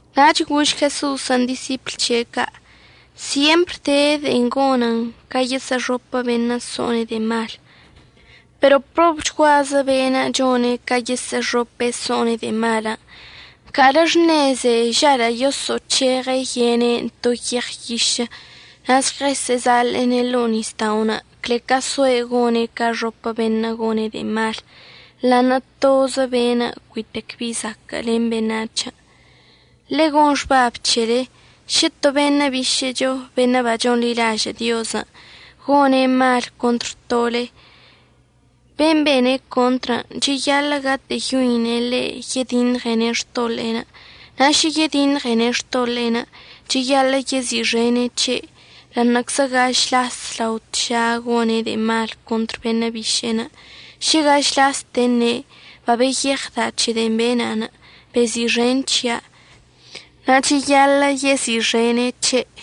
Nach gož Jeso'osən' disipl c̱he' ca': ―Syempr de de'en gonən ca yesə'əxopə beṉə' so'one' de'e malən'. Pero probchguazə beṉə' chone' ca yesə'əxope' so'one' de'e malən'. Nca'alə xṉeze žalə' yoso'oc̱heɉe' yene'enə' to yeɉ yišə' na' žɉəsə'əzaḻe'ene' ḻo'o nisda'onə' cle ca soe' gone' ca əxopə beṉə' gone' de'e malən' ḻa'aṉə' tozə beṉə' cuitec bi zaquə' len beṉac̱hən'. Ḻe'e gon xbab c̱hele, šə to beṉə' bišə'əcho beṉə' bachonḻilažə' Diozən' gone' mal contr tole, ben' bene' contr cheyaḻə' gatə'əyoine' ḻe' yediṉɉene' xtoḻe'enə', na' šə yediṉɉene' xtoḻe'enə' cheyaḻə' yezi'ixene' c̱he'. Ḻa'aṉə'əczə gaž las lao tža gone' de'e mal contr beṉə' biše'enə', šə gaž laste əṉe': “Babeyeɉda' c̱he de'en bena', bezi'ixen c̱hia'”, na' cheyaḻə' yezi'ixene' c̱he'.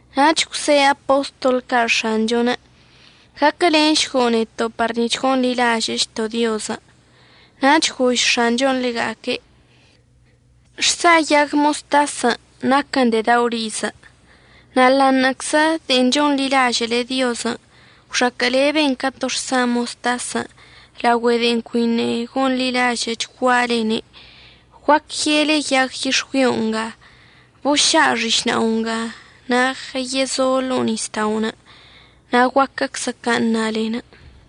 Nach gwse' apostol ca' X̱anchon': ―Gaquəlenšgo' neto' par nic̱h gonḻilažə'əchto' Diozən'. Nach gož X̱anchon' ḻega'aque': ―Xsa yag moztasən' naquən de'e dao' rizə'. Na' ḻa'aṉə'əczə de'en chonḻilažə'əle Diozən' gwxaquə'əleben ca to xsa moztasən' laogüe de'en cuiṉə' gonḻilažə'əchgualene', guac ye'ele yag yix̱güio nga: “Boša' xišna'o nga na' žɉəyezo' ḻo'o nisda'onə'”, na' guaquəczə can' ṉalenə'.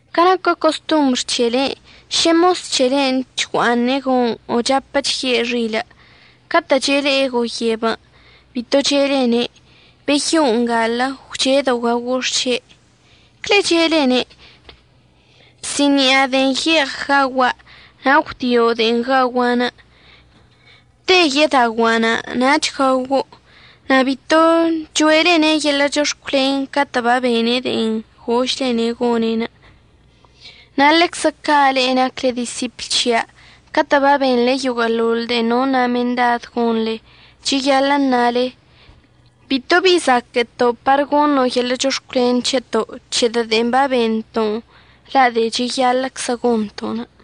Ca naquə costombr c̱helen' šə mos c̱helen' chgua'aṉe' go'oṉ o chapə chye' xilə', catə' chele'e goyebən' bito che'elene': “Beyo'o ngalə gwche'edo' gaogo' xše'.” Cle che'elene': “Bsi'ini'a de'en ye'eɉ gaogua' na' gwdio' de'en gaogua'anə'. Te yedaogua'anə' nach gaogo'.” Na' bito cho'elene' yeḻə' chox̱cwlen catə' babene' de'en gožlene' gone'. Na' ḻeczə ca' le'e nacle disipl c̱hia', catə' babenḻe yoguə'əḻoḻ de'en nona' mendad gonḻe cheyaḻə' əṉale: “Bito bi zaquə'əto' par goṉo' yeḻə' chox̱cwlen c̱heto', c̱hedə' de'en babento'onə' la' de'e cheyaḻə'əczə gonto'onə'.”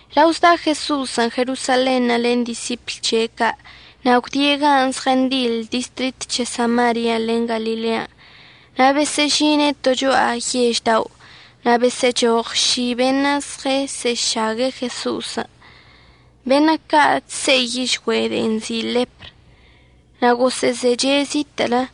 Lao zda' Jeso'osən' Jerosalenṉə' len disipl c̱he' ca' na' gwdie' gan' zɉəndiḻ distrit c̱he Samaria len Galilean'. Na' besə'əžine' to cho'a yež dao' na' besə'əchoɉ ši beṉə' zɉesə'əšague' Jeso'osən', beṉə' ca' chse'i yižgüe' de'en nzi' ḻepr, na' gosə'əzeche' zitə'ələ.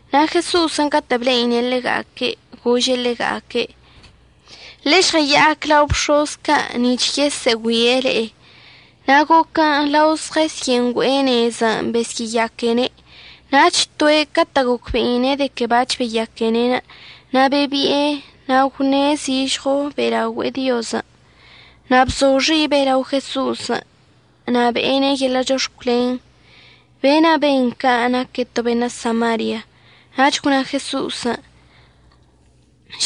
Na' Jeso'osən' catə' ble'ine' ḻega'aque' gože' ḻega'aque': ―Ḻežɉəya'ac lao bx̱oz ca' nic̱h yesə'əgüie' le'e. Na' goquən' lao zezyə'əngüe'e nezən' besyə'əyaquene'. Nach toe' catə' gocbe'ine' de que bac̱h beyaquene' na' bebi'e na' gwṉe' zižɉo be'elaogüe'e Diozən'. Na' bzo xibe' lao Jeso'osən' na' be'ene' yeḻə' chox̱cwlen. Be'enə' ben ca' naque' to beṉə' Samaria. Nach gwna Jeso'osən':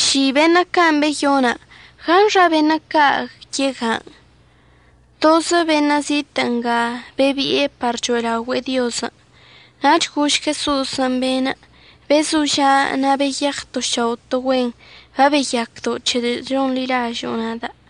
―Ši beṉə' can' beyona'. ¿Gaṉxa beṉə' ca' yegan'? Tozə beṉə' zitə' nga bebi'e par cho'elaogüe'e Diozən'. Nach gož Jeso'osən' be'enə': ―Bezoža' na' beyeɉ to šao' to güen. Babeyacdo' c̱hedə' c̱honḻilažo'o nada'.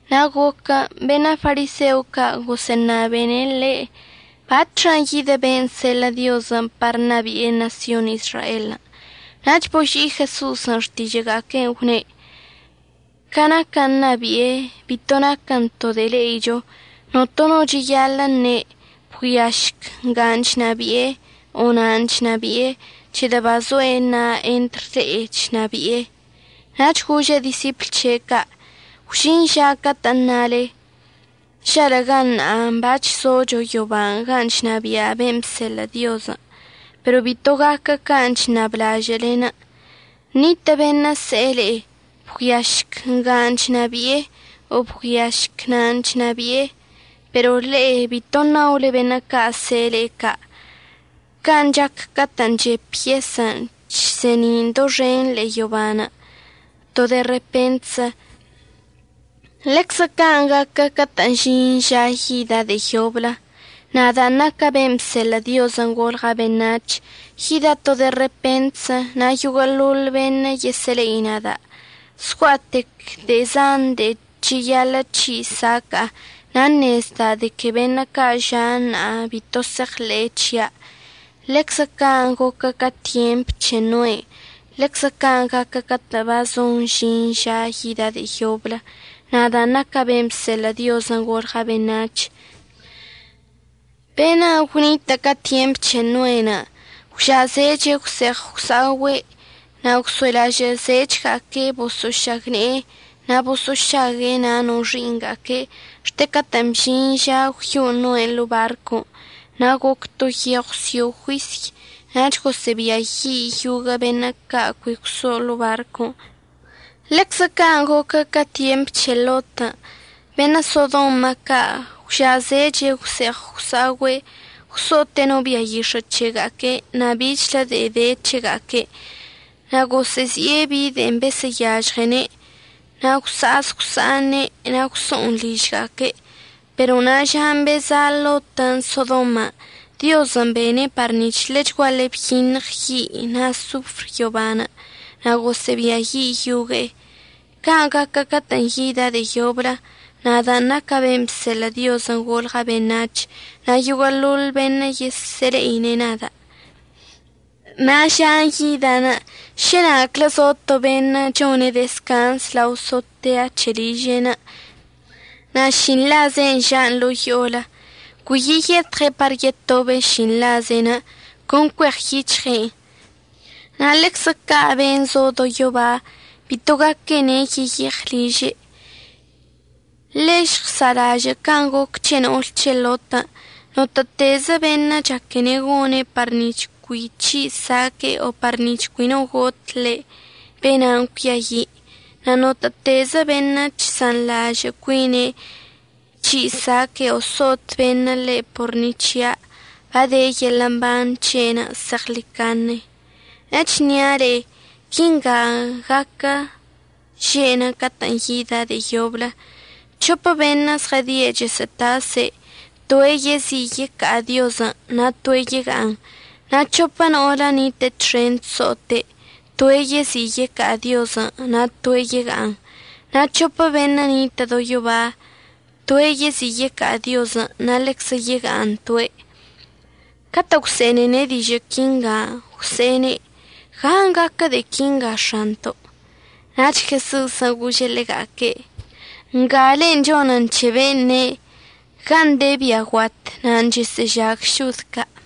Na' goquən' beṉə' fariseo ca' gosə'əṉabene' ḻe' batxan' yidə ben' əseḻə' Diozən' par ṉabi'e ṉasyon Izraelən'. Nach boži' Jeso'osən' xtižə'əga'aque'enə' gwne': ―Ca naquən' ṉabi'enə' bito naquən to de'e le'icho. Notono no cheyaḻə' əṉe': “Bgüiašc nga chnabi'e”, o “Na' chnabi'e”, c̱hedə' bazoe' ṉa'a entr le'e chnabi'e. Nach gože' disipl c̱he' ca': ―Gwžin ža catə'ən ṉale: “Žalə'əga ṉa'a bac̱h zocho yoban' gan' chnabia' ben' bseḻə' Diozən'.” Pero bito gaquə can' chṉablažə'əlenə'. Nitə' beṉə' əse'e le'e: “Bgüiašc nga chnabi'e”, o “Bgüiašc na' chnabi'e”, pero le'e bito ṉaole beṉə' ca' əse'e le'e ca'. Can' chac catə' chep yesən' chse'eni'in doxenḻə ḻe'e yoban' to de repentzə, ḻeczə can' gaquə catə'ən əžin ža yida' de'e yoblə, nadan' naca' ben' bseḻə' Diozən' golɉa' beṉac̱h yida' to de'e repentzə na' yoguə'əḻoḻ beṉə' yesə'əle'ine' nada'. Zgua'atec de de'e zan de'e cheyaḻə' c̱hi' saca'a, na' ṉezda' de que beṉə' ca' ža' ṉa'a bito se'eɉḻe'e c̱hia'. Ḻeczə can' goquə ca tyemp c̱he Noenə', ḻeczə can' gaquə catə'ən bazon əžin ža yida' de'e yoblə, nadan' naca' ben' bseḻə' Diozən' golɉa' beṉac̱h. Beṉə' gwnitə' ca tyemp c̱he Noen' gwža'azeche' gwse'eɉ gwsa'ogüe' na' gwso'elaozechga'aque' bosə'əšagne'e na' boso'ošague' na' no xi'iṉga'aque' xte catə'ən bžin ža gwyo'o Noen' ḻo'o barcon', na' goc to yeɉw sio' juisy nach gosə'əbiayi' yoguə' beṉə' ca' cui gwso'o ḻo'o barcon'. Ḻeczə can' goquə ca tyemp c̱he Lotən'. Beṉə' Sodoma ca' gwža'azeche' gwse'eɉ gwsa'ogüe', gwso'ote'e no bia yix̱ə' c̱hega'aque' na' bichlə de'e de c̱hega'aque', na' gosə'əzi'e bi de'en besə'əyažɉene' na' gwsa'az gwsa'aṉe' na' gwso'on ližga'aque'. Pero na' žan' beza' Lotən' Sodoman', Diozən' bene' par nic̱h ḻechguaḻe byiṉɉ yi' na' sofr yobanə' na' gosə'əbiayi' yogue'e. Can' gaquə catə'ən yida' de'e yoblə, nadan' naca' ben' bseḻə' Diozən' golɉa' beṉac̱h, na' yoguə'əḻoḻ beṉə' yesə'əle'ine' nada'. Na' žan' yida' šə na'aclə zo to beṉə' chone' dezcanz lao sotea c̱he' liže'enə' na' šinḻaze'enə' ža'an ḻo'o yo'onə', cui yeyetɉe' par yetobe' šinḻaze'enə', con cueɉyic̱hɉe'en. Na' ḻeczə ca' ben' zo do yoba bito gaquene' yeyeɉ liže'. Ḻe'e žɉsa'alažə' can' goc c̱he no'ol c̱he Lotən'. Notə'ətezə beṉə' chaquene' gone' par nic̱h cui c̱hi' saque'e o par nic̱h cui no got ḻe', be'enan' cuiayi'. Na' notə'ətezə beṉə' chsanḻažə' cuine' c̱hi' saque'e o so'ot beṉə' ḻe' por ni c̱hia', bade yeḻə' mban c̱he'enə' zeɉḻicaṉe. Echnia' le'e, quinga gaquə že'enə' catə'ən yida' de'e yoblə: C̱hopə beṉə' zɉədie' chəsə'ətase', toe' yezi' yeca'a Diozən' na' toe' yega'aṉ. Na' c̱hopə no'olə ṉitə' txen chso'ote', toe' yezi' yeca'a Diozən', na' toe' yega'aṉ. Na' c̱hopə beṉə' ṉitə' do yoba, toe' yezi' yeca'a Diozən' na' ḻeczə yega'aṉ toe'. Catə' gwse'enene' dižə' quinga, gwse'ene': ―¿Gan' gaquə de'e quinga X̱anto'? Nach Jeso'osən' gože' ḻega'aque': ―Ngale'en chonen c̱he ben' ne': “Gan' de bia guat nan' chesə'əžag šod ca'.”